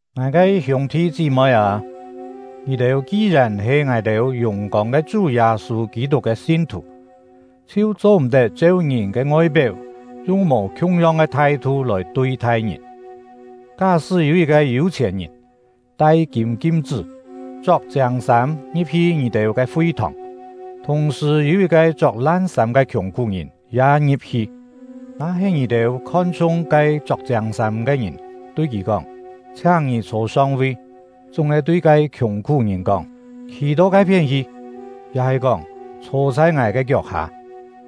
Ngài ke hiûng-thi chí-moi â, ngì-têu ki-yèn he ngài-têu yùng-kông ke Chú Yâ-sû Kî-tuk ke sin-thù, chhiu cho-m̀-tet cheu ngìn ke ngoi-péu yung mò khiung-yong ke thai-thu lòi tui-thai ngìn. Ká-sṳ́ yû yit-ke yû-chhièn-ngìn, tai kîm kim-chṳ́, chok chiâng sâm, ngi̍p-hi ngì-têu ke fi-thòng, thùng-sṳ̀ yû yit-ke chok lan sâm ke khiùng-khú-ngìn ya ngi̍p-hi; na-he ngì-têu khon-chhung ke chok chiâng sâm ke ngìn, tui kì kóng: “Chhiáng ngì chhô song-vi”, chúng-he tui ke khiùng-khú-ngìn kóng: “Khî to ke-phién hi”, ya-he kóng: “Chhô chhai ngài ke kiok-hâ”,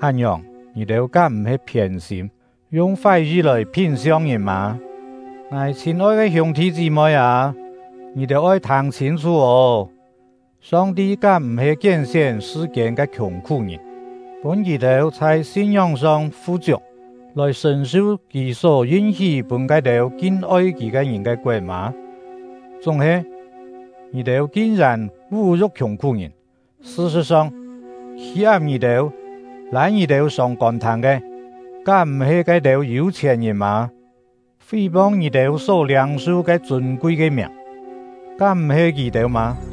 án-ngiòng, ngì-têu kám m̀-he phiên-sîm, yung fái-yi lòi phín-siong ngìn mâ? Ngài chhîn-oi ke hiûng-thi chí-moi â, ngì-têu oi thâng chhîn-chhú ô! Song-ti kám m̀-he kién-sién sṳ-kiên ke khiùng-khú-ngìn, pûn kì-têu chhai sin-ngióng-song fu-chiuk, lòi sṳ̀n-su Kì só yin-hí pûn ke-têu kin-oi Kì ke ngìn ke koet mâ? Chúng-he, ngì-têu kin-yèn vú-yu̍k khiùng-khú-ngìn! Sṳ-sṳ̍t-song, khî-ap ngì-têu, lâi ngì-têu sông kôn-thâng ke, kám m̀-he ke-têu yû-chhièn-ngìn mâ? Fí-pong ngì-têu só liâng-su ke chûn-kui ke miàng, kám m̀-he kì-têu mâ?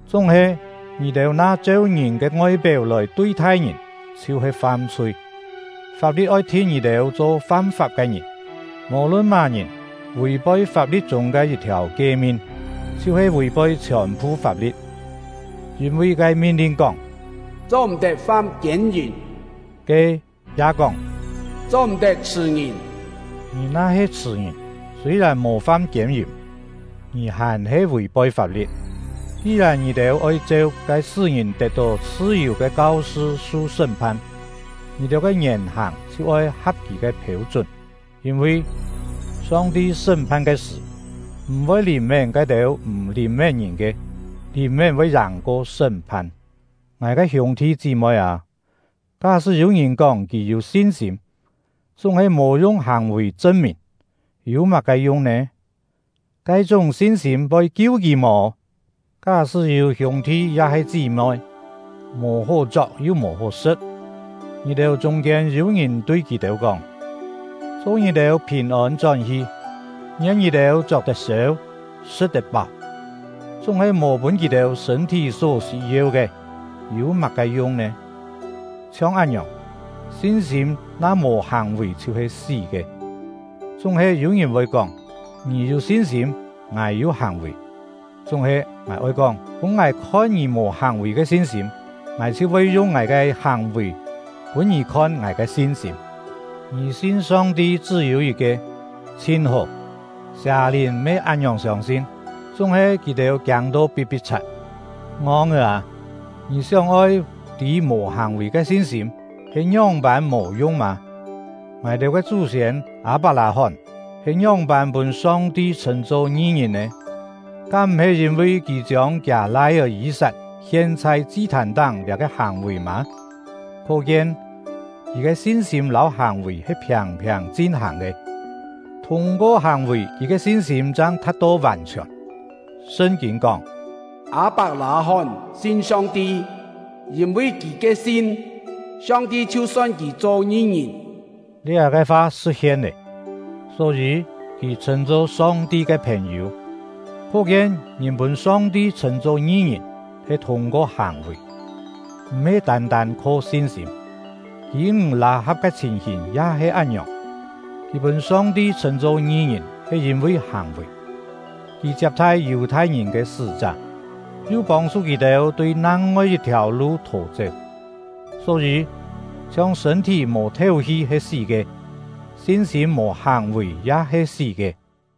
Chúng-he, ngì-têu na cheu ngìn ke ngoi-péu lòi tui-thai ngìn, chhiu-he fam-chhui; fap-li̍t oi thin ngì-têu cho fam-fap ke ngìn. Mò-lun má-ngìn vì-poi fap-li̍t chûng ke yit-thiàu kie-min, chhiu-he vì-poi chhiòn-phu fap-li̍t. Yîn-vi ke min-lin kóng “Cho-m̀-tet fam kiên-yìm” ke, ya kóng “Cho-m̀-tet chhṳ̀ ngìn”. Ngì na-he chhṳ̀ ngìn, sûi-yèn mò fam kiên-yìm, ngì hàn-he vì-poi fap-li̍t. Ki-yèn ngì-têu oi cheu ke pûn ngìn tet-tó chhṳ-yù ke kau-sṳ su sṳ́m-phan, ngì-têu ke ngièn-hàng chhiu oi ha̍p kì ke phêu-chún. Yîn-vi, Song-ti sṳ́m-phan ke sṳ̀, m̀-voi lìn-mén ke-têu m̀ lìn-mén ngìn ke. Lìn-mén voi yàng-ko sṳ́m-phan. Ngài ke hiûng-thi chí-moi â, ká-sṳ́ yû-ngìn kóng kì yû sin-sîm, chúng-he mò yung hàng-vì chṳn-mìn, yû má-ke yung nè? Ke-chúng sin-sîm voi kiu kì mò? Ká-sṳ́ yû hiûng-thi ya-he chí-moi, mò hó chok yu mò hó sṳ̍t, ngì-têu chûng-kiên yû-ngìn tui kì-têu kóng: “Cho ngì-têu phìn-ôn chón-hi! Ngien ngì-têu chok-tet-sêu, sṳ̍t-tet-páu!” chúng-he mò pûn kì-têu sṳ̂n-thí só sî-yeu ke, yû má-ke yung nè? Chhiong án-ngiòng, sin-sîm na mò hàng-vì chhiu-he sí ke. Chúng-he, yû-ngìn voi kóng: “Ngì yû sin-sîm; ngài yû hàng-vì.” Chúng-he, ngài oi kóng: “Pûn ngài khon ngì mò hàng-vì ke sin-sîm; ngài chhiu voi yung ngài ke hàng-vì pûn ngì khon ngài ke sin-sîm.” Ngì sin Song-ti chṳ́-yû yit-ke, chhin hó! Sià-lìn me án-ngiòng siông-sin, chúng-he kì-têu kiâng-to pi̍t-pi̍t-chhat. Ngong-é â! Ngì sióng-oi tî mò hàng-vì ke sin-sîm he ngióng-pân mò yung mâ? Ngài-têu ke chú-siên Â-pak-lâ-hón he ngióng-pân pûn Song-ti chhṳ̂n-cho ngi-ngìn nè? Kám m̀-he yîn-vi kì chiông kiâ lai-é Yî-sat hien chhai chi-thàn-táng liá-ke hàng-vì mâ? Khó-kien, kì ke sin-sîm lâu hàng-vì he phiàng-phiàng chin-hàng ke; thûng-ko hàng-vì kì ke sin-sîm chang tha̍t-to vàn-chhiòn. Sṳn-kîn kóng: “Â-pak-lâ-hón sin Song-ti, yîn-vi kì ke sin, Song-ti chhiu son kì cho ngi-ngìn.” Liá-ke fa sṳ̍t-hien lé; só-yî, kì chhṳ̂n-cho Song-ti ke phèn-yû. Khó-kien, ngìn pûn Song-ti chhṳ̂n-cho ngi-ngìn he thûng-ko hàng-vì, m̀-he tân-tân kho sin-sîm. Kî-ńg Lâ-ha̍p ke chhìn-hìn ya he án-ngiòng. Kì pûn Song-ti chhṳ̂n-cho ngi-ngìn he yîn-vi hàng-vì; kì chiap-thai Yù-thai-ngìn ke sṳ́-chá, yu pông-chhu kì-têu tui nang-ngoi yit-thiàu lu thò-chéu. Só-yî, chhiong sṳ̂n-thí mò théu-hi he sí ke, sin-sîm mò hàng-vì ya he sí ke.